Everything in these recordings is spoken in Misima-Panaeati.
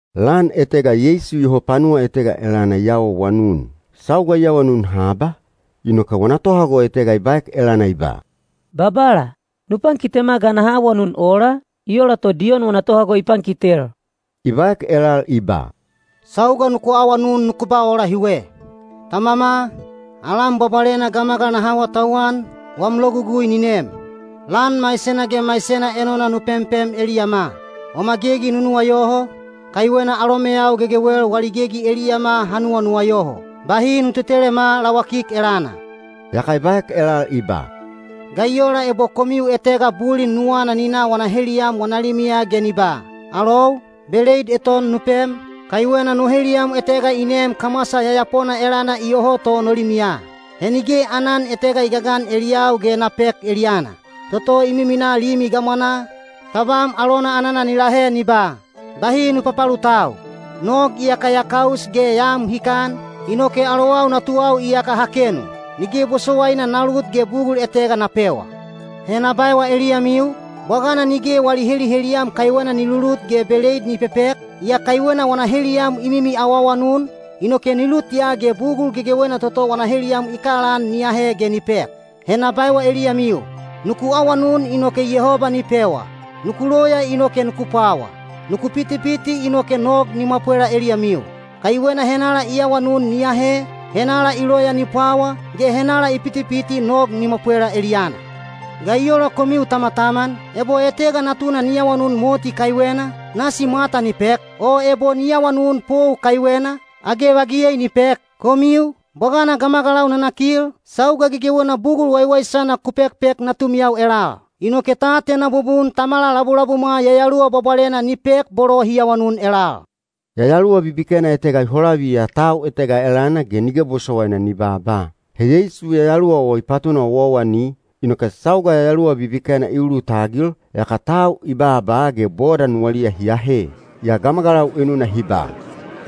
Lan etega Yeisu iyoho panuwa etega elana i awaawanun. Sauga i awanun haba, inoke wana tohago etega i baek elana i ba, “Babala, nu pankitema ga naha awanun ola, i ola to Diyon wana tohago i pankitel.” I baek elal i ba, “Sauga nuku awanun nuku ba ola hiwe: Tamama, alam bwabwalena gamagal naha awatauwan, wam logugui ni nem. Lan maisena ge maisena enona nu pempem eliyama. Wama gegi nu nuwayoho, kaiwena alomeyau gegewel wali gegi eliyama ha nuwanuwayoho. Bahi nu tetelema lawakik elana.” Yaka i baek elal i ba, “Ga i ola ebo komiu etega bulin nuwana ni na wana heliyam wana limiya ge ni ba, ‘Alou, beleid eton nu pem, kaiwena no heliyam etega i neem kamwasa yayapona elana iyoho to no limiya. He nige aanan etega i gagan eliyau ge na pek eliyana.’ Toto i miminaa limi gamwanaa, tabam alona anana ni lahe ni ba, ‘Bahi nu papalutau. Nog iyaka ya kaus ge ya am hikan, inoke alowau natuwau iyaka ha kenu. Nige bosowaina na lut ge bugul etega na pewa.’ He na baewa eliyamiu, bwagana nige wali heliheliyam kaiwena ni lulut ge beleid ni pepek, yaa kaiwena wana heliyam i mimi awaawanun, inoke ni lut ya ge bugul gegewena toto wana heliyam i kalaan ni ahe ge ni pek. “He na baewa eliyamiu: nuku awanun inoke Yehoba ni pewa; nuku loya inoke nuku pwawa; nuku pitipiti inoke nog ni mwapwela eliyamiu. Kaiwena henala i awanun ni ahe, henala i loya ni pwawa, ge henala i pitipiti nog ni mwapwela eliyana. “Ga i ola komiu tamataman, ebo etega natuna ni awanun moti kaiwena, nasi mwata ni pek? O ebo ni awanun pou kaiwena, age vagiyei ni pek? Komiu, bwagana gamagalau nanakil, sauga gegewena bugul waiwaisana ku pekpek natumiyau elal. Inoke ta atena bubun Tamala labulabumwa Yayaluwa Bwabwalena ni pek bolo hi awanun elal.” Yayaluwa bibikena etega i holaviya tau etega elana ge nige bosowaina ni baaba. He Yeisu yayaluwa o i patuna owaowani, inoke sauga yayaluwa bibikena i ulutagil, yaka tau i baaba ge boda nuwaliya hi ahe. Yaa gamagalau enuna hi ba,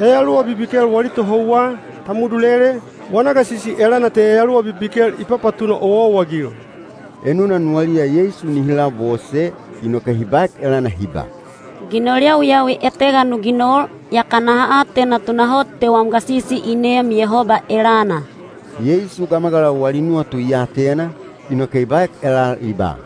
“Yayaluwa bibikel wali tohouwa, Tamudulele, wana gasisi elana te yayaluwa bibikel i papatuna owaowa-agil.” Enuna nuwaliya Yeisu nihi labose, inoke hi baek elana hi ba, “Ginol yawiyawi etega nu ginol, yaka naha atena tunahot te wam gasisi i neem Yehoba elana.” Yeisu gamagalau wali nuwatu i atena, inoke i baek elal i ba,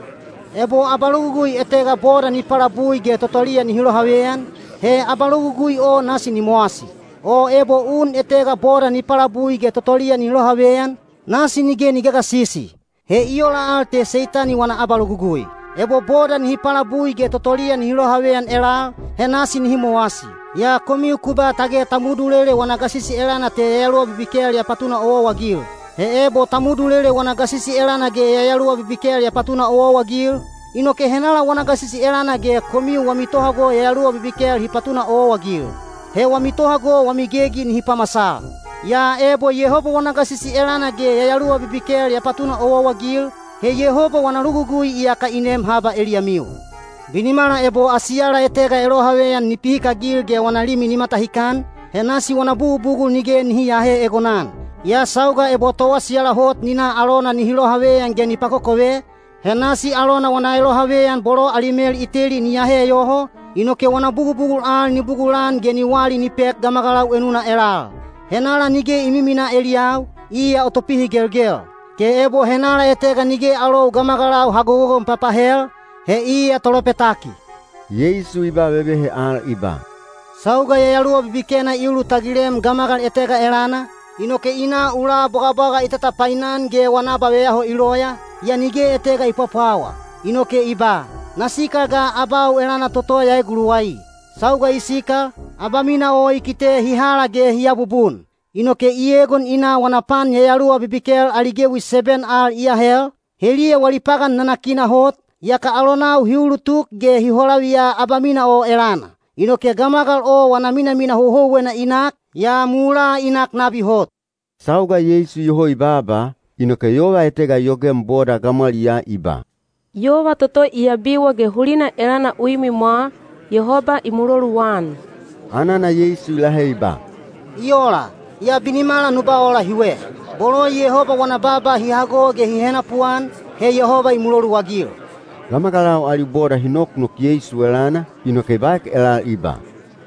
“Ebo abalogugui etega boda ni palabui ge totoliya nihi lohaveyan, he abalogugui o nasi ni mowasi. O ebo un etega boda ni palabui ge totoliya nihi lohaveyan, nasi nige ni gagasisi. He i ola al te Seitani wana abalogugui. Ebo boda nihi palabui ge totoliya nihi lohaveyan elal, he nasi nihi mowasi. Yaa komiu ku ba tage Tamudulele wana gasisi elana te yayaluwa bibikel ya papatuna owaowa-agil. He ebo Tamudulele wana gasisi elana ge yayaluwa bibikel ya papatuna owaowa-agil, inoke henala wana gasisi elana ge komiu wami tohago yayaluwa bibikel hi papatuna owaowa-agil? He wami tohago wami gegi nihi pamasal. Yaa ebo Yehoba wana gasisi elana ge yayaluwa bibikel ya papatuna owaowa-agil, he Yehoba wana logugui iyaka i nem haba eliyamiu. “Binimala ebo asiyala etega elohaveyan ni pihikagil ge wana limi ni matahikan, he nasi wana bugubugul nige nihi aahe egonan. Yaa sauga ebo toasiyala hot ni na alona nihi lohaveyan ge ni pakokove, he nasi alona wana elohaveyan bolo ali mel i teli ni ahe yoho, inoke wana bugubugul al ni bugulan ge ni wali ni pek gamagalau enuna elal. “Henala nige i miminaa eliyau, iya o topihigelgel. Ge ebo henala etega nige alou gamagalau ha gogogon papahel, he iya tolopetaki.” Yeisu i ba vevehe al i ba, “Sauga yayaluwa bibikena i ulutagilem gamagal etega elana, inoke i na ula bwagabwaga i tatapainan ge wana abaveyaho i loya, yaa nige etega i pwapwawa. Inoke i ba, ‘Na sikal ga abau elana toto ya eguluwai.’ Sauga i sikal, abamina o i kite hi hala ge hi abubun. Inoke i egon i na wana pan yayaluwa bibikel ali gewi seben al i ahel, heliya wali pagan nanakina hot, yaka alonau hi ulutuk ge hi holaviya abamina o elana. Inoke gamagal o wana minamina houhouwena i nak, yaa mulaa i nak nabi hot.” Sauga Yeisu iyoho i baaba, inoke yova etega i yogem boda gamwaliyaa i ba, “Yova toto i abiwa ge hulina elana u imwimwa, Yehoba i muloluan.” Anana Yeisu i lahe i ba, “I ola, yaa binimala nu ba ola hiwe: bolo Yehoba wana baaba hi hago ge hi henapuan, he Yehoba i muloluagil.” Gamagalau ali boda hi noknok Yeisu elana, inoke i baek elal i ba,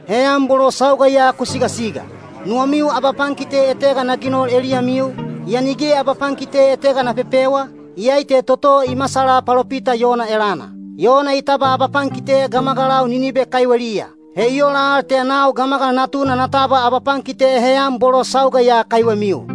“Heyan bolo sauga ya ku sigasiga. Nuwamiu abapankite etega na ginol eliyamiu, yaa nige abapankite etega na pepewa, iyai te toto i masala palopita Yona elana. Yona i tabwa abapankite gamagalau Ninibe kaiweliya. He i ola al te nau Gamagal Natuna na tabwa abapankite heyan bolo sauga ya kaiwemiu.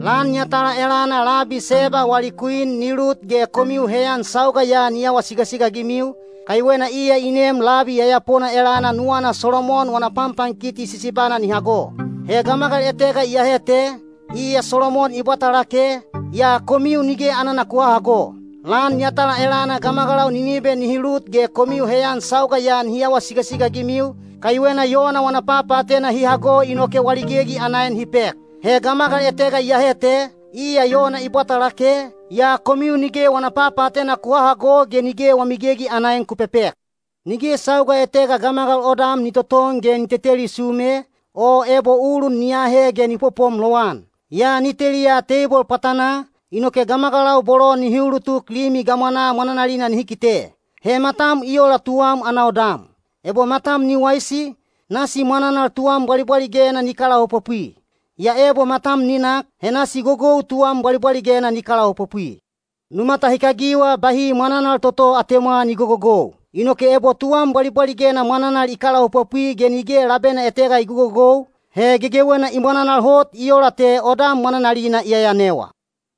Lan yatala elana labi Seba wali kwin ni lut ge komiu heyan sauga ya ni awa sigasiga-agimiu, kaiwena iya i neem labi yayapona elana nuwana Solomon wana panpankiti sisibana ni hago. He gamagal etega iyahe te, iya Solomon i bwata lake, yaa komiu nige anana ku hahago. Lan yatala elana gamagalau Ninibe nihi lut ge komiu heyan sauga ya nihi awa sigasiga-agimiu, kaiwena Yona wana papaatena hi hago inoke wali gegi ana en hi pek. He gamagal etega iyahe te, iya Yona i bwata lake, yaa komiu nige wana papaatena ku hahago ge nige wami gegi ana en ku pepek.” Nige sauga etega gamagal odam ni toton ge ni teteli sume, o ebo ulun ni aahe ge ni popom lowan. Yaa ni teliya teibol pwatanaa, inoke gamagalau bolo nihi ulutuk limi gamwanaa mwananalina nihi kite. He matam i ola tuwam ana odam. Ebo matam ni waisi, nasi mwananal tuwam bwalibwaligena ni kalaopopwi. Yaa ebo matam ni nak, he nasi gogou tuwam bwalibwaligena ni kalaopopwi. Nu matahikagiwa bahi mwananal toto atemwa ni gogogou. Inoke ebo tuwam bwalibwaligena mwananal i kalaopopwi ge nige labena etega i gogogou, he gegewena i mwananal hot i ola te odam mwananalina i yayanewa.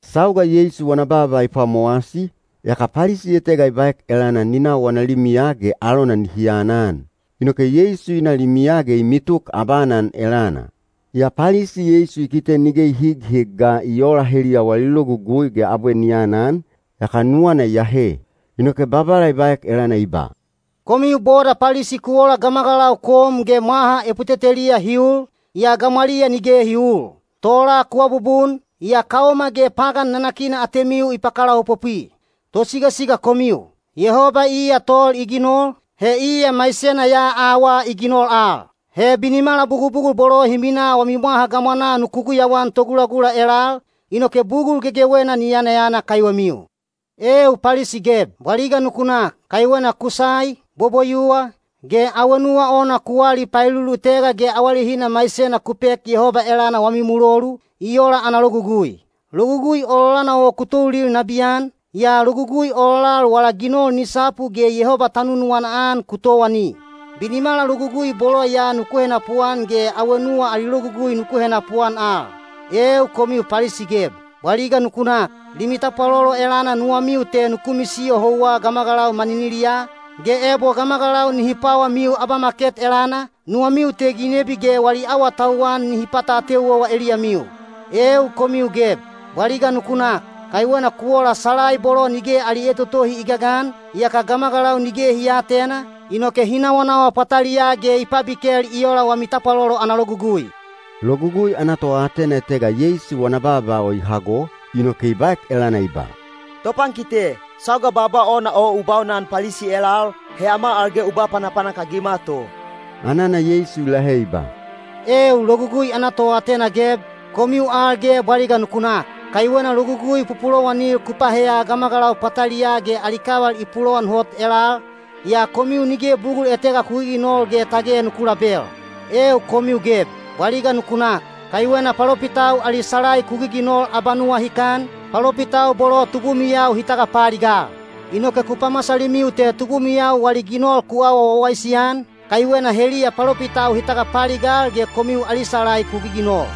Sauga Yeisu wana baaba i pwamowasi, yaka Palisi etega i baek elana ni na wana limiya ge alona nihi anan. Inoke Yeisu i na limiya ge i mituk abaanan elana. Yaa Palisi Yeisu i kite nige i highig ga i oola heliya wali logugui ge abwe ni anan, yaka nuwana i ahe. Inoke Babala i baek elana i ba, “Komiu boda Palisi ku ola gamagalau kom ge mwaha eputeteliya hi ul, yaa gamwaliya nige hi uul. Tola ku abubun, yaa kaoma ge pagan nanakina atemiu i pakalaopopwi. Tosigasiga komiu! Yehoba iya tol i ginol, he iya maisena ya awaa i ginol al. He binimala bugubugul bolo hi minaa wami mwaha gamwanaa nuku guyauan togulagula elal, inoke bugul gegewena ni yanayana kaiwemiu. “Eeu Palisi geb, bwaliga nuku nak! Kaiwena kusai, boboyuwa, ge awenuwa ona ku wali paelulutega ge awalehina maisena ku pek Yehoba elana wami mulolu, i ola ana logugui. Logugui ololana o ku toulil nabiyan, yaa logugui ololal wala ginol ni sapu ge Yehoba ta nunuwana-an ku towani. Binimala logugui bolo ya nuku henapuan ge awenuwa ali logugui nuku henapuan al. “Eeu komiu Palisi geb, bwaliga nuku nak! Limi tapwalolo elana nuwamiu te nuku misiyo houwa gamagalau maniniliyaa, ge ebo gamagalau nihi pwawamiu abamaket elana, nuwamiu te ginebi ge wali awatauwan nihi pata ateu owa eliyamiu. “Eeu komiu geb, bwaliga nuku nak! Kaiwena ku ola salai bolo nige ali etotohi i gagan, yaka gamagalau nige hi aatena, inoke hi nawanawa pwataliyaa ge i pabikel i ola wami tapwalolo ana logugui.” Logugui ana toatena etega Yeisu wana baaba o i hago, inoke i baek elana i ba, “Topankite, sauga baaba ona o u baunan Palisi elal, he ama al ge u ba panapanak-agima to.” Anana Yeisu i lahe i ba, “Eeu logugui ana toatena geb, komiu al ge bwaliga nuku nak! Kaiwena logugui pupulowanil ku paheya gamagalau pwataliyaa ge ali kaval i pulowan hot elal, yaa komiu nige bugul etega ku giginol ge tage nuku label. “Eeu komiu geb, bwaliga nuku nak! Kaiwena palopitau ali salai ku giginol abanuwahikan, palopitau bolo tubumiyau hi tagapaaligal. Inoke ku pamasalimiu te tubumiyau wali ginol ku awa wawaisi-an, kaiwena heliya palopitau hi tagapaaligal ge komiu ali salai ku giginol.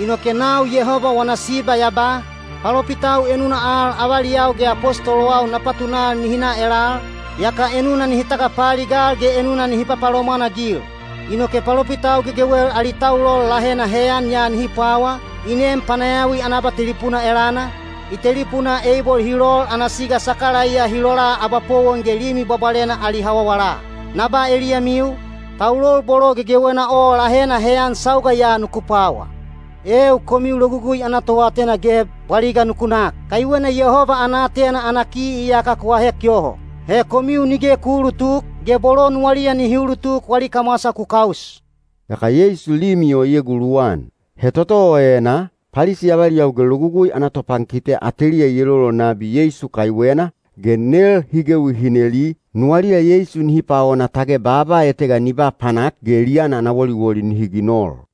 Inoke nau Yehoba wana Siba ya ba, ‘Palopitau enuna al avaliyau ge apostolowau na patunal nihi na elal, yaka enuna nihi tagapaaligal ge enuna nihi papalomwan-agil. Inoke palopitau gegewel ali taulol lahena heyan ya nihi pwawa, i neem panayawi ana abatelipuna elana, i telipunaa Eibol hi lol ana siga Sakalaiya hi lola abapowon ge Limi Bwabwalena ali hawawala.’ Na ba eliyamiu, taulol bolo gegewena o lahena heyan sauga ya nuku pwawa. “Eeu komiu logugui ana toatena geb, bwaliga nuku nak! Kaiwena Yehoba ana aatena ana ki iyaka ku ahek yoho. He komiu nige ku uulutuk, ge bolo nuwaliya nihi ulutuk wali kamwasa ku kaus.” Yaka Yeisu limi o i eguluwan. He toto o enaa, Palisi avaliyau ge logugui ana topankite ateliya i elolol nabi Yeisu kaiwena, ge nel hi gewi hi neli, nuwaliya Yeisu nihi paona tage baaba etega ni ba panak ge eliyana ana woliwoli nihi ginol.